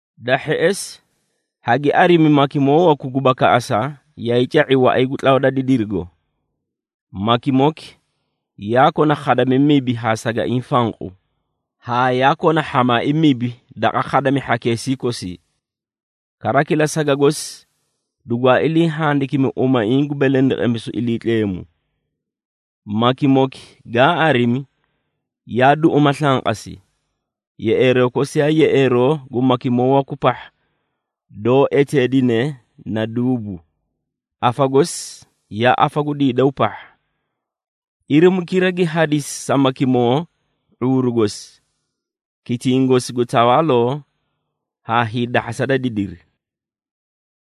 Da hheꞌesi, hagi arimi makimoo waku gu bakaꞌasa yaay ca⁄i waꞌay gu tlawa da didirigo. Makimoki yaa kona khadami mibi haa sagaiĩ fanqu, haa yaa kona hhamaai mibi daqa khadami hhakeesii kosii. Kara kila saga gosi dugwaa ilii handakimi umaiĩ gu belendeqemisu Iliitleemu. Makimoki gaa arimi, yaa duꞌuma slanqasi, yeꞌeeroo kosi yaa yeꞌeeroo gu makimoo waku pahha doó eteedine na duubu, afa gosi yaa afa gu diidaw pahha. Irimukira gi hadisi sa makimoki ⁄uuru gosi, kitiĩ gosi gu tawaaloo haa hiidahhasa da didiri.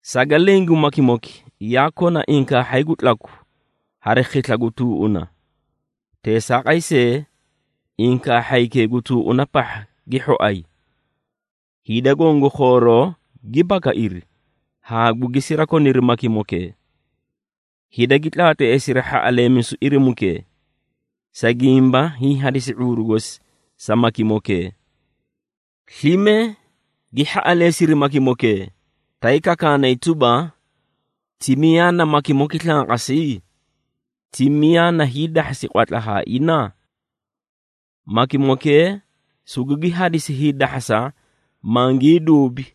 Saga leẽ gu makimoki, yaa kona inkaahhay gu tlaku hari khisla gu tuuꞌuna. Teesaaqay see, inkaahhaykee gu tuuꞌuna pahha gi hhoay! Hida goõ gu khooroo gi bakairi haa gugi sirakoniri makimokee. Hida gi tlaatleesiri hhaꞌaleemisu irimukee, sa gimba hiĩ hadisi ⁄uuru gosi sa makimokee. Slime gi hhaꞌaleesiri makimokee, tay kakaanay tuba, “Ti miyaa na makimoki slanqasi? Ti miyaa na hiidahhasi qwatla haa ina?” Makimokee sugugi hadisi hiidahhasa mangii duubi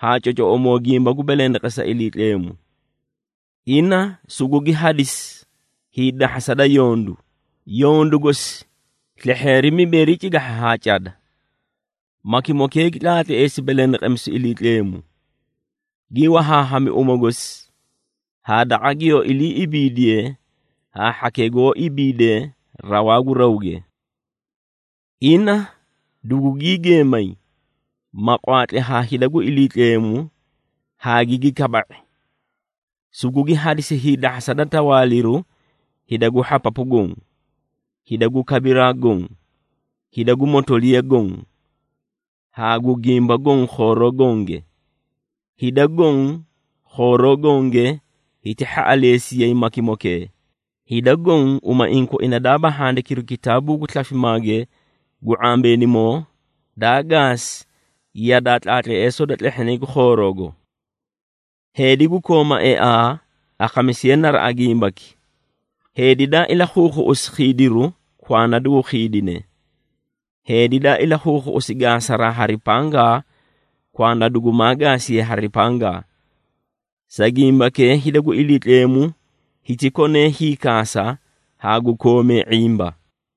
ha cocoꞌomoo gimba gu belendeqesa Iliitleemu. Ina sugugi hadisi hiidahhasa da yondu, yondu gosi slehheeri mibeeri cigahha haa cada. Makimokee gi tlaatleesi belendeqemisu Iliitleemu, gi wahaahami uma gosi haa daqa giyoó iliiꞌibiidiye haa hhakee goó ibiidee rawaa gu rawge. Ina dugugii geemay ma gwaatli haa hida gu Iliitleemu haa gigi kaba⁄i. Sugugi hadisi hiidahhasa da tawaaliru hida gu hhapapu goõ, hida gu kabiraa goõ, hida gu motoliya goõ, haa gu gimba goõ khooroo gonge. Hida goõ, khooroo gonge hiti hhaꞌaleesiyay makimokee, hida goõ umaiĩ koina daaba handikiru kitaabuu gu slafimaage gu ⁄ambeenimoo, daa gaasi yadaa tlaatleesoo da tlehhinay gu khooroogo. Heedi gu kooma eaa, akhamisiye naraꞌa gimbaki. Heedi daa ilakhuukhuꞌusi khiidiru kwanda dugu khiidine. Heedi daa ilakhuukhuuꞌusi gaasaraa hari pangaa, kwanda dugumaa gaasiye hari pangaa. Sa gimbakee hida gu Iliitleemu hiti konee hiikaasa haa gu koomee ⁄imba.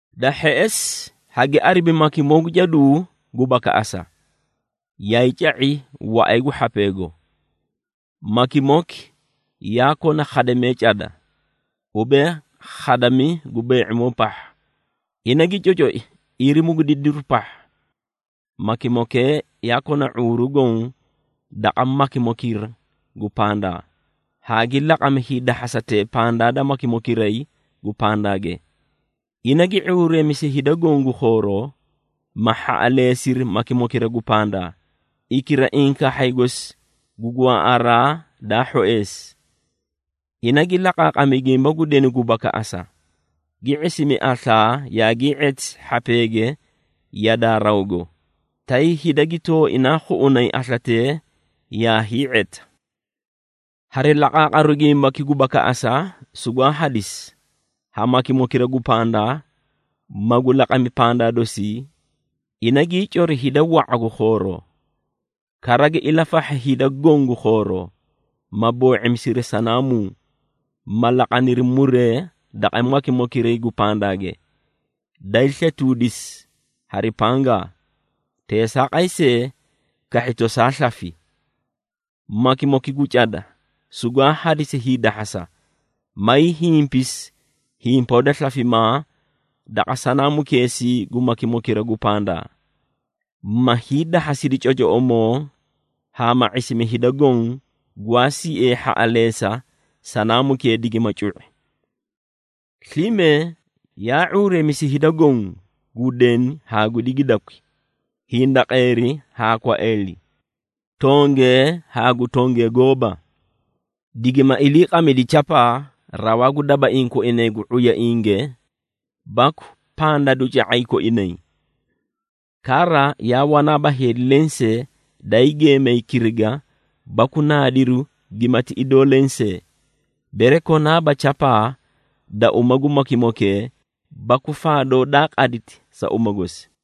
Da hheꞌesi, hagi arimi makimoo gu caduu gu bakaꞌasa, yaay ca⁄i waꞌay gu hhapeego. Makimoki yaa kona khadamee cada, ubee khadami gu bee⁄imoo pahha, ina gi cocoi irimu gu didiru pahha. Makimokee yaa kona ⁄uuru goõ daqa makimokira gu pandaa, haa gi laqami hiidahhasatee pandaa da makimokiray gu pandaage. Ina gi ⁄uureemisi hida goõ gu khooroo, ma hhaꞌaleesiri makimokira gu pandaa, hikira inkaahhay gosi gu gwaaꞌaraa daa hhoeesi. Ina gi laqaaqami gimba gu denu gu bakaꞌasa, gi ⁄isimi aslaa yaagii⁄eti hhapeege yadaa rawgo, tay hida gi tooinaa khuꞌunay aslatee yaa hii⁄eta. Hari laqaaqaru gimbaki gu bakaꞌasa sugwaa hadisi, ha makimokira gu pandaa, magu laqami pandaa dosii, ina gii coridi hida wa⁄a gu khooroo. Kara gi ilafahhi hida goõ gu khooroo, ma boo⁄imisiri sanaamuu, ma laqaniri muree daqa makimokiray gu pandaa, daay sletuudisi hari pangaa, teesaaqay see, kahhi tosaa slafi. Makimoki gu cada sugwaa hadisi hiidahhasa, mayii himpisi himpoo da slafimaa daqa sanaamukeesii gu makimokira gu pandaa, ma hiidahhasidi cocoꞌomoo haa ma ⁄isimi hida goõ, gwaa siee hhaꞌaleesa sanaamukee digima cu⁄i. Slime yaa ⁄uureemisi hida goõ, gu deni haa gu digidakwi, hindaqeeri haa kwaeeli, tongee haa gu tongee gooba, digima iliiqamidi chapaa rawaa gu dabaiĩ koinay gu ⁄uyainge baku pandaduca⁄ay koinay. Kara, yaa wanaaba heedi lensee daay geemay kiriga baku naadiru gimati idoo leẽ see, bere konaaba chapaa da uma gu makimokee baku faadoo daa qaditi sa uma gosi.